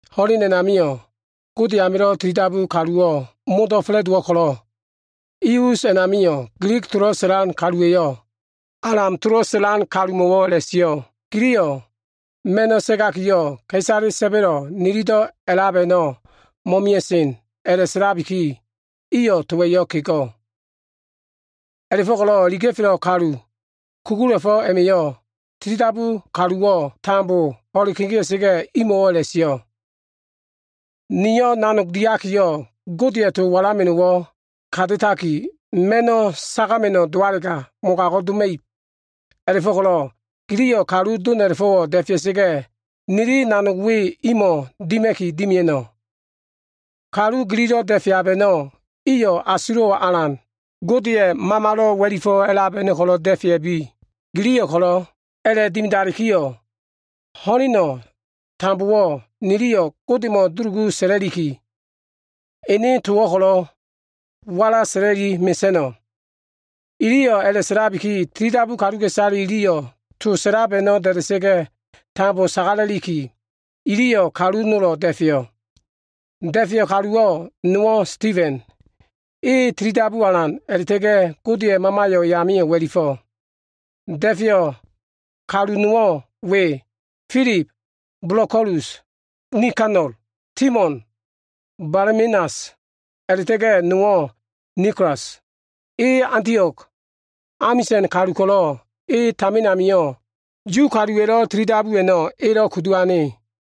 Ho꞉len a꞉namio꞉ Gode amilo꞉ tilidabu kaluwo꞉ modo꞉ fa꞉la꞉dowo꞉ ko꞉lo꞉, i us a꞉namio꞉ Gilig tolo꞉ sa꞉lan kaluwa꞉yo꞉, Alam tolo꞉ sa꞉lan kalumo꞉wo꞉ a꞉la꞉sio꞉, “Giliyo꞉ ma꞉no꞉ sagakiyo꞉, ka꞉isale sa꞉ba꞉lo꞉ nilido꞉ a꞉lab a꞉no꞉ mo꞉mia꞉sen” a꞉la꞉sa꞉laki, iyo꞉ towa꞉yo꞉ kego꞉. A꞉la꞉fo꞉ko꞉lo꞉ iliga꞉felo꞉ kalu kugula꞉fo꞉ a꞉ma꞉yo꞉, tilidabu kaluwo꞉ tambo ho꞉le kegea꞉sa꞉ga꞉, imo꞉wo꞉ a꞉la꞉sio꞉, “Nio꞉ nanog diakiyo꞉, Godeya꞉ to walama꞉no꞉wo꞉ ka ta꞉taki, ma꞉no꞉ sagama꞉no꞉ dowalega mogago꞉ doma꞉ib. A꞉la꞉fo꞉ko꞉lo꞉ giliyo꞉ kalu dom a꞉la꞉fo꞉wo꞉ da꞉fea꞉sa꞉ga꞉, niliyo꞉ nanog we imo꞉ dima꞉ki dimia꞉no꞉. Kalu gililo꞉ da꞉feab a꞉no꞉, iyo꞉ asulo꞉wo꞉ alan, Godeya꞉ Mamalo꞉ wa꞉lifo꞉ a꞉lab a꞉no꞉ ko꞉lo꞉ da꞉fea꞉bi. Giliyo꞉ ko꞉lo꞉ a꞉la꞉dimidalikiyo꞉, ho꞉leno꞉ tambowo꞉ niliyo꞉ Godemo꞉ dulugu sa꞉la꞉liki, ene towo꞉ ko꞉lo꞉ walasa꞉la꞉li mesa꞉no꞉.” Iliyo꞉ a꞉la꞉sa꞉labiki, tilidabu kaluka꞉isale iliyo꞉ to sa꞉lab a꞉no꞉ da꞉da꞉sa꞉ga꞉ tambo sagalaki, iliyo꞉ kalu nolo꞉ da꞉feyo꞉. Da꞉feyo꞉ kaluwo꞉ nowo꞉ Sitifen. E tilidabuwo꞉ alan a꞉la꞉ta꞉ga꞉ Godeya꞉ Mamayo꞉ e amio꞉ wa꞉lifo꞉. Da꞉feyo꞉ kalu nowo꞉ we, Filib, Bolokolus, Nikanol, Timon, Bamenas, a꞉la꞉ta꞉ga꞉ nowo꞉ Nikolas, e Antio꞉g amisa꞉n kalu ko꞉lo꞉ e tamin amio꞉ Yu kaluwa꞉lo꞉ tilidabu a꞉no꞉ elo꞉ kudu ane.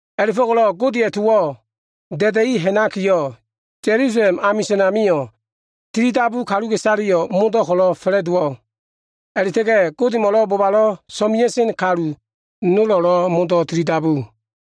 A꞉la꞉fo꞉ko꞉lo꞉ Godeya꞉ towo꞉ da꞉da꞉i ha꞉nakiyo꞉, Ya꞉lusalem amisa꞉n amio꞉ tilidabu kaluka꞉isaleyo꞉ modo꞉ ko꞉lo꞉ fa꞉la꞉dowo꞉. A꞉la꞉ta꞉ga꞉ Godemo꞉lo꞉ bobalo꞉ so꞉mea꞉sen kalu nolo꞉lo꞉ modo꞉ tilidabu.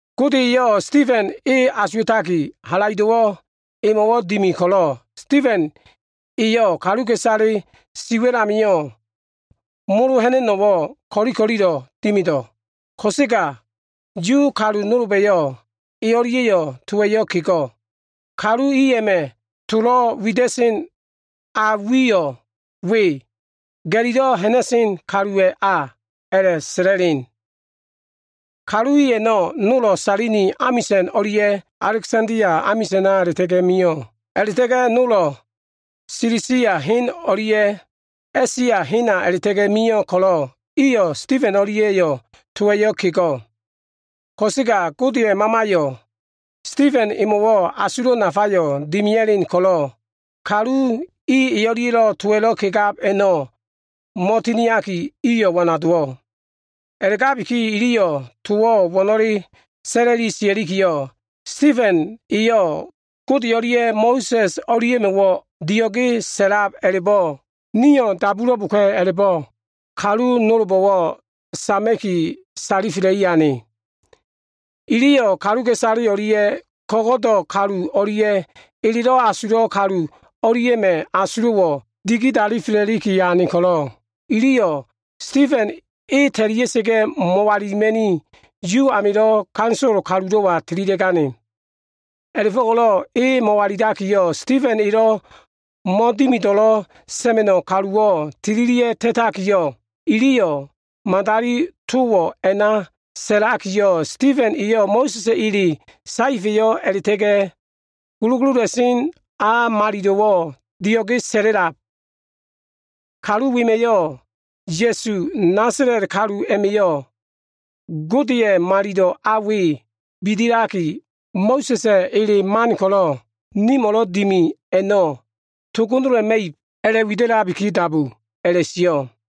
Gode eyo꞉ Sitifeno꞉ asuwa꞉taki, halaido꞉wo꞉ emo꞉wo꞉ dimi ko꞉lo꞉, Sitifen eyo꞉ kaluka꞉isale siwa꞉l amio꞉ molo ha꞉na꞉no꞉wo꞉ ko꞉li ko꞉lilo꞉ dimido꞉. Ko꞉sega Yu kalu nolba꞉yo꞉ e o꞉lia꞉yo꞉ towa꞉yo꞉ kego꞉. Kalu i a꞉ma꞉ tolo꞉ wida꞉sen a wiyo꞉ we “Ga꞉lilo꞉ ha꞉na꞉sen kaluwa꞉ a” a꞉la꞉sa꞉la꞉sen. Kalu i a꞉no꞉ nolo꞉ Sailini amisa꞉n o꞉lia꞉ Alegsandia amisa꞉na a꞉la꞉ta꞉ga꞉ mio꞉. A꞉la꞉ta꞉ga꞉ nolo꞉, Silisia hen o꞉lia꞉ A꞉sia hena a꞉la꞉ta꞉ga꞉ mio꞉ ko꞉lo꞉ iyo꞉ Sitifen o꞉lia꞉yo꞉ towa꞉yo꞉ kego꞉. Ko꞉sega Godeya꞉ Mamaya꞉yo꞉ Sitifen emo꞉wo꞉ asulo꞉ nafayo꞉ dimia꞉len ko꞉lo꞉, kalu i e o꞉lia꞉lo꞉ towa꞉lo꞉ kegab a꞉no꞉ mo꞉tiniaki, iyo꞉ wana dowo꞉. A꞉la꞉gabiki, iliyo꞉ towo꞉ wo꞉no꞉le sa꞉la꞉li sia꞉likiyo꞉, “Sitifen eyo꞉ Gode o꞉lia꞉ Mo꞉sa꞉s o꞉lia꞉mo꞉wo꞉ dio꞉ge sa꞉lab a꞉la꞉bo꞉ niyo꞉ dabulo꞉boka꞉” a꞉la꞉bo꞉ kalu nolbo꞉wo꞉ sama꞉ki, salifela꞉i ane. Iliyo꞉ kaluka꞉isale o꞉lia꞉ ko꞉go꞉do꞉ kalu o꞉lia꞉ elelo꞉ wida꞉sen kalu o꞉lia꞉ma꞉ asulo꞉wo꞉ digidalifela꞉liki ane ko꞉lo꞉, iliyo꞉ Sitifen e ta꞉lia꞉sa꞉ga꞉ mo꞉walilima꞉ni, Yu amilo꞉ ganisolo kalulo꞉wa tililia꞉gane. A꞉la꞉fo꞉ko꞉lo꞉ e mo꞉walilakiyo꞉, Sitifen elo꞉ mo꞉dimido꞉lo꞉ sa꞉ma꞉no꞉ kaluwo꞉ tililia꞉ga꞉ ta꞉taki, iliyo꞉ madali towo꞉ a꞉na sa꞉lakiyo꞉, “Sitifen eyo꞉ Mo꞉sa꞉s ele saefa꞉yo꞉ a꞉la꞉ta꞉ga꞉ gulugulula꞉sen a malilo꞉wo꞉ dio꞉ge sa꞉la꞉lab. Kalu wema꞉yo꞉ ‘Ya꞉su, Nasala꞉t kalu a꞉ma꞉yo꞉ Godeya꞉ Malilo꞉ a we bidilaki, Mo꞉sa꞉sa꞉ ele man ko꞉lo꞉ nimo꞉lo꞉ dimi a꞉no꞉ togonola꞉ma꞉ib’ a꞉la꞉wida꞉labiki dabu” a꞉la꞉sio꞉.